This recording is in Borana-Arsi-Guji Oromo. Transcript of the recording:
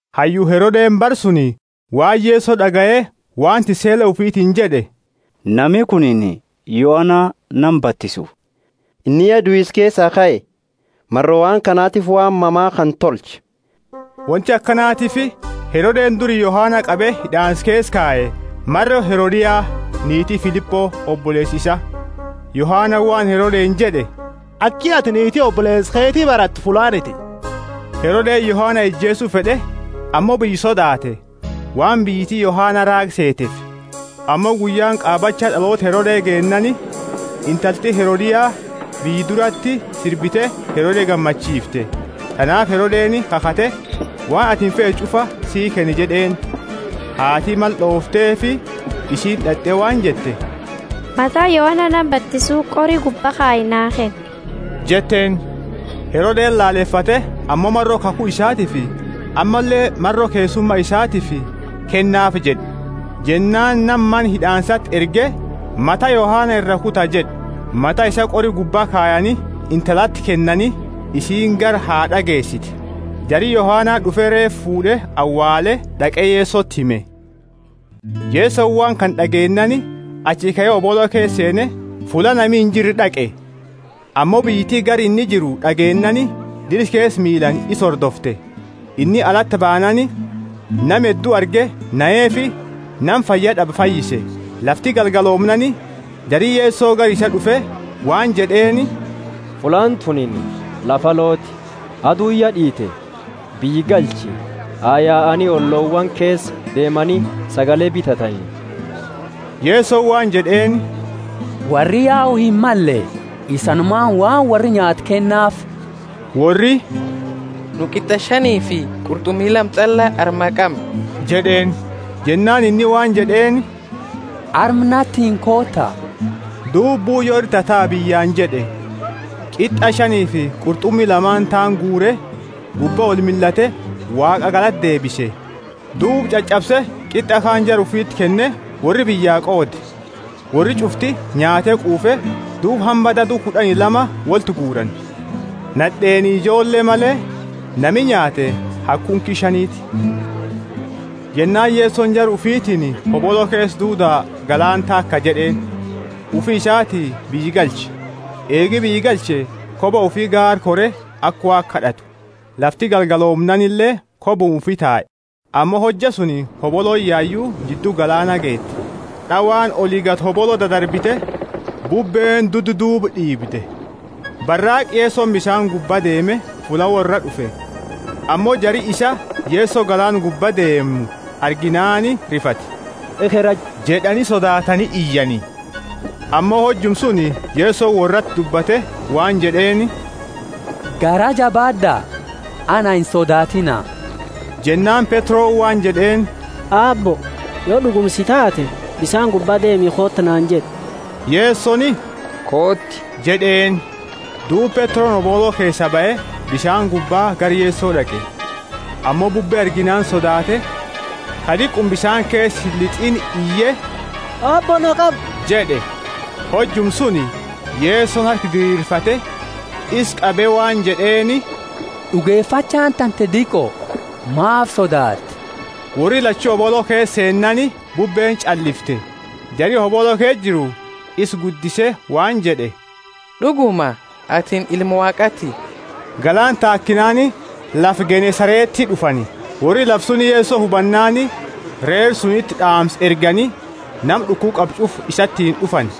Hayyu Herode, bara suni, waan Yeso d'agaye, waan tissele ufitiini jed'e, Nami kunini Yohana nama batisu; inni ya duisa keesaa kae; maro waan kanatifi waan mama kana tolcha. Wonti akanatiifi Herodeni duri Yohana qabe hid'aansa keesa kaye, maro Herodia, niiti Filipo, oboleesa isaa. Yohanani waan Herodeni jed'e, Aki atini niiti oboleesa keti barattu fullaaniti. Herodeni Yohana ijeesu fed'e, ammo biyya sodaate, waan biyyiti Yohana raaga seetefi. Ammo guyyaani qaabacha d'aloota Herode geennaani, intalti Herodia biyya durati sirbite Herode gammachiifte. Tanaafi Herodeni kakhate, Waan atini feetu ch'ufa sii kenna jed'eeni. Haati mala d'oofteefi, isiini d'at'e waan jette, Mata Yohana nama batisu qori gubba kayi naa kenni jetteeni. Herodeni lalefate, ammo maro kakhu isaatiifi ammalle maro keessuma isaatiifi, Kennaafi jed'e. Jennaani nama mana hid'aansati erge, Mata Yohana iraa kuta jed'e. Mata isaa qori gubba kayani intalati kennani, isiini gara haad'a geesite. Jari Yohana d'ufe reefa fuud'e awaale, d'aqe Yesoti hime. Yesoni waan kana d'ageennaani achi kae hobolo keesa seene fulla nami injirre d'aqe. Ammo biyyiti gara inni jiru d'ageennaani dira keesa miilaani isa hordofte. Inni alati baanaani nama heddu arge, naheefi nama fayyad'abe fayyise. Lafti galgaloomnaani jari Yeso gara isaa d'ufe waan jed'eeni, Fullaani tunini lafa alooti, aduuni ya d'iite, biyya galchi, ha yaani ollowaani keesa deemani sagale bitatani. Yesoni waan jed'eeni, Worri yau himmalle; isanumaani waan worri nyaatu kennaafi. Worri, Nu qit'a shanifi qurt'umi lama ch'alla arma qamna jed'eeni. Jennaani inni waan jed'eeni, Arma natiini koota. Duuba, Buuyo ira tataa biyyaani jed'e, qit'a shanifi qurt'umi lamaani taani guure, gubba olmillate, Waaqa galata deebise, duuba ch'ach'abse, qit'a kaani jara ufiti kenne; worri biyya qoode. Worri ch'ufti nyaate quufe. Duuba hamba dadu kud'ani lama wolti guurani. Nad'eeni ijoolle male, nami nyaate haga kunki shaniti. Jennaani Yesoni jara ufitiini, Hobolo keesa duuda galaana taaka jed'eeni, ufi isati biyya galche. Eegi biyya galche, koba ufi gaara kore aka Waaqa kad'atu. Lafti galgaloomnaanile kobuma ufi tae; ammo hojja suni hobolooni yayu jiddu galaana geete, d'awaani oli gadi hobolo dadarbite, bubbeeni duddaduuba d'iibde. Baraaqa Yesoni bisaani gubba deeme fulla worraa d'ufe. Ammo jari isaa Yeso galaana gubba deemu arginaani rifate, Ekhera jed'ani sodaatani iyani. Ammo hojuma suni Yesoni worrati dubbate waan jed'eeni, Garaa jabaad'a, ana insodaatiina. Jennaani Petroni waan jed'eeni, Aabbo, yo d'uguma si taate, Bisaani gubba deemi kooti naani jed'i. Yesoni, Kooti jed'eeni. Duuba Petroni hobolo keesaa bahe, bisaani gubba gara Yeso d'aqe. Ammo bubbe arginaani sodaate, ka diquma bisaani keesa illit'iini iye, Aabbo, na qabi jed'e. Hojuma suni Yesoni harka diriirfate isa qabe waan jed'eeni, D'ugefachaani tante diqo! Maafi sodaatte? Worri lachu hobolo keesa seennaani bubbeeni ch'allifte. Jari hobolo keesa jiru isa guddise waan jed'e, D'uguma atini Ilma Waaqaati. Galaana taakinaani lafa Genesareti d'ufani. Worri lafa suni Yeso hubannaani reera suniti d'aamsa ergani nama d'ukuba qabu ch'ufaa isatiini d'ufani.